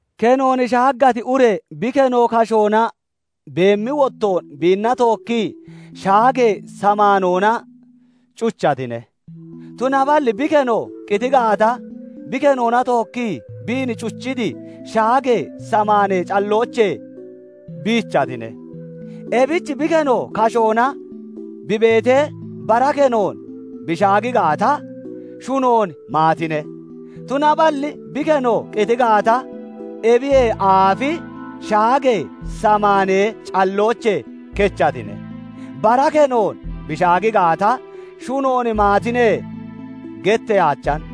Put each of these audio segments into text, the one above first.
Kenoon shaaggati ure bi keno kashoona beemmi wottoon, biinna tookkii shaagee samaanoona cuchatine; tunaballi bi keno qiti gaata, bi kenoona tookkii biin cuchiti shaagee samaanee calloochee biichatine. Ebich bi keno kashoona bi beetee, bara kenoon bi shaagi gaata, shunoon maatine; tunaballi bi keno qiti gaata, ebiyee aafi shaagee samaanee calloochee kechatine; bara kenoon bi shaagi gaata, "Shunoon maatine" getteeyaachan.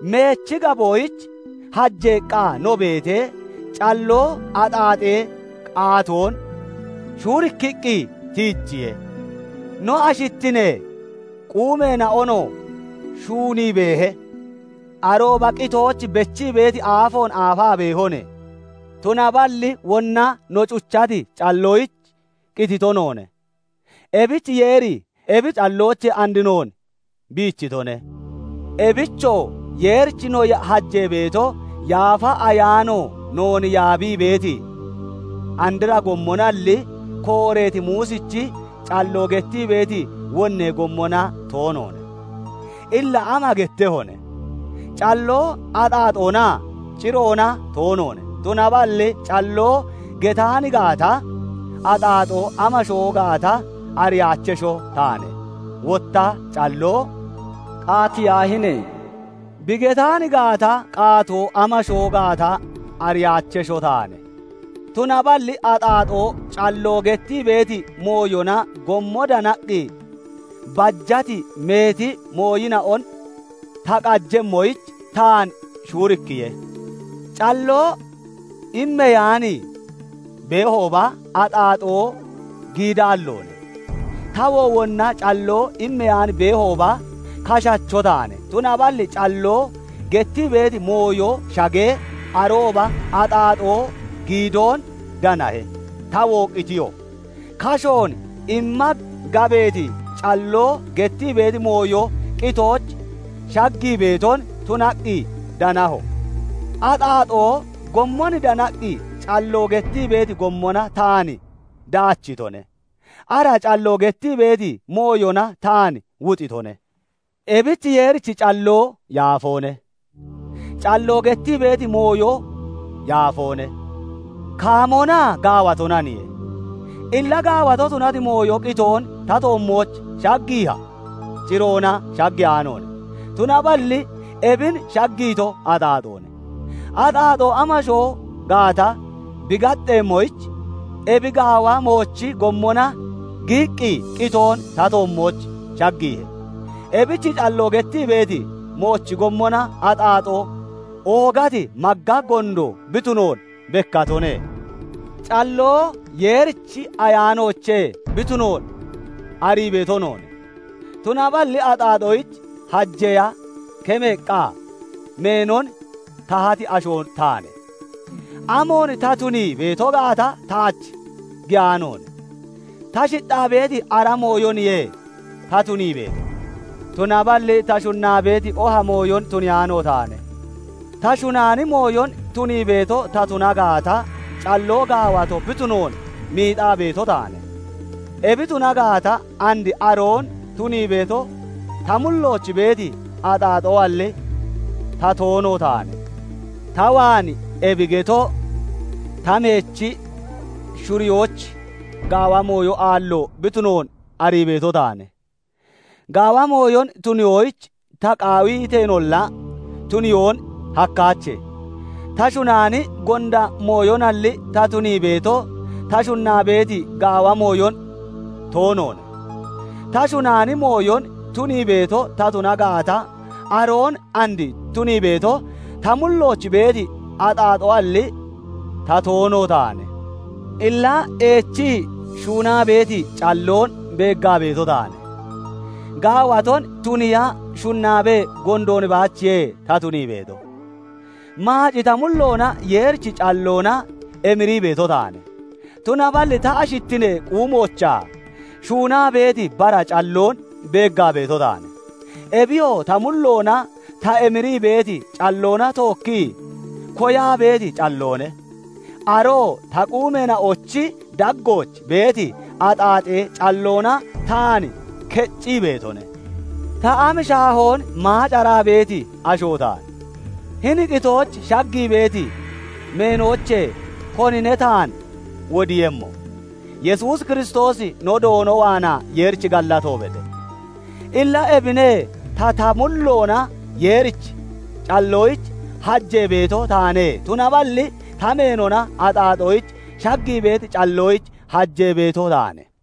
Meechi gaboyich hajeeqqa no beetee, calloo axaaxee qaatoon shuurikkiqqi tiijiye; no ashittinee quumeena'onoo shuunii beehe; arooba qitooch bechii beeti aafoon aafaa beehone. Tunaballi wonna no cuchati calloyich qitito noone; ebich Yeeri ebi calloochee and noon biichitone; ebichoo Yeerich no hajee beeto, Yaafa Ayaano noon yaabii beeti andra gommonalli, kooreeti Muusichi calloo gettii beeti wonnee gommona toonoone. Illa ama gettehone? Calloo axaaxoona? Ciroona toonoone; tunaballi calloo getaan gaata, axaaxoo amasho gaata ariyaachesho taane; wotta calloo "Qaatiyaahine!" bi getaan gaata, qaatoo amasho gaata ariyaachesho taane. Tunaballi axaaxoo calloo gettii beeti mooyona gommon danaqqi bajati meeti mooyina'on ta qaatemmoyich taan shuurikkiye; calloo immeyaan beehooba, axaaxoo giidaalloone. Tawoo wonna calloo immeyaan beehooba, kashacho taane; tunaballi calloo gettii beeti mooyo shagee, arooba axaaxoo giidoon danahe; tawoo qitiyo; kashoon imma gabeeti calloo gettii beeti mooyo qitooch shaggii beeton tunaqqi danaho. Axaaxoo gommon danaqqi calloo gettii beeti gommona taan dachitone; ara calloo gettii beeti mooyona taan wuxitone. Ebich Yeerichi calloo yaafoone; calloo gettii beeti mooyoo yaafoone; kaamoonaa gaawatonaniye. Illa gaawato tunati mooyo qitoon ta toommooch shaggiiha? Ciroona shaggiyaanoone; tunaballi ebin shaggiito axaaxoone; axaaxoo amasho gaata bi gaxxeemmoyich ebi gaawa moochi gommona giyiqqi qitoon ta toommooch shaggiihe. Ebich calloo gettii beeti moochi gommona axaaxoo oogati magga gondo bi tuno bekkatone. Calloo Yeerichi Ayaanoochee bi tunoon arii beeto noone; tunaballi axaaxoyich hajeeya kemmeeqqa meenon tahati asho taane. Amoon ta tunii beeto gaata taach giyaanoone; ta shixxaa beeti ara mooyoniye ta tunii beeto; tunaballi ta shunnaa beeti oha mooyon tuniyaano taane. Ta shunaani mooyon tunii beeto ta tuna gaata, calloo gaawato bi tunoon miixaa beeto taane. Ebi tuna gaata, and aroon tunii beeto ta mullooch beeti axaaxoalli, ta toono taane. Ta waan, ebi getoo ta meechi shuriyooch, gaawa mooyo aallo bi tunoon arii beeto taane; gaawa mooyon tuniyoyich ta qaawiteenolla, tuniyoon hakkaache. Ta shunaani gonda mooyonalli ta tunii beeto, ta shunnaa beeti gaawa mooyon toonoone. Ta shunaani mooyon tunii beeto ta tuna gaata, aroon and tunii beeto ta mullooch beeti axaaxoalli, ta toono taane. Illa eechii shuunaa beeti calloon beeggaa beeto taane; gaawaton tuniiya shunnaabee gondoon baachiye ta tunii beeto. Maaci ta mulloona Yeerichi calloona emirii beeto taane; tunaballi ta ashittinee quumoochaa shuunaa beeti bara calloon beeggaa beeto taane; ebiyoo ta mulloona ta emirii beeti calloona tookkii koyaa beeti calloone; aroo ta quumeena'ochi daggooch beeti axaaxee calloona taan keccii beetone. Ta am shaahoon maacaraa beeti asho taane! Hini qitooch shaggii beeti meenoochee konine taan wodiiyemmo? Yesuus Kiristoosi no Doono waanaa Yeerich gallato bede. Illa ebine; ta ta mulloona Yeerichi calloyich hajee beeto taane; tunaballi ta meenona axaaxooch shaggii beeti calloyich hajee beeto taane.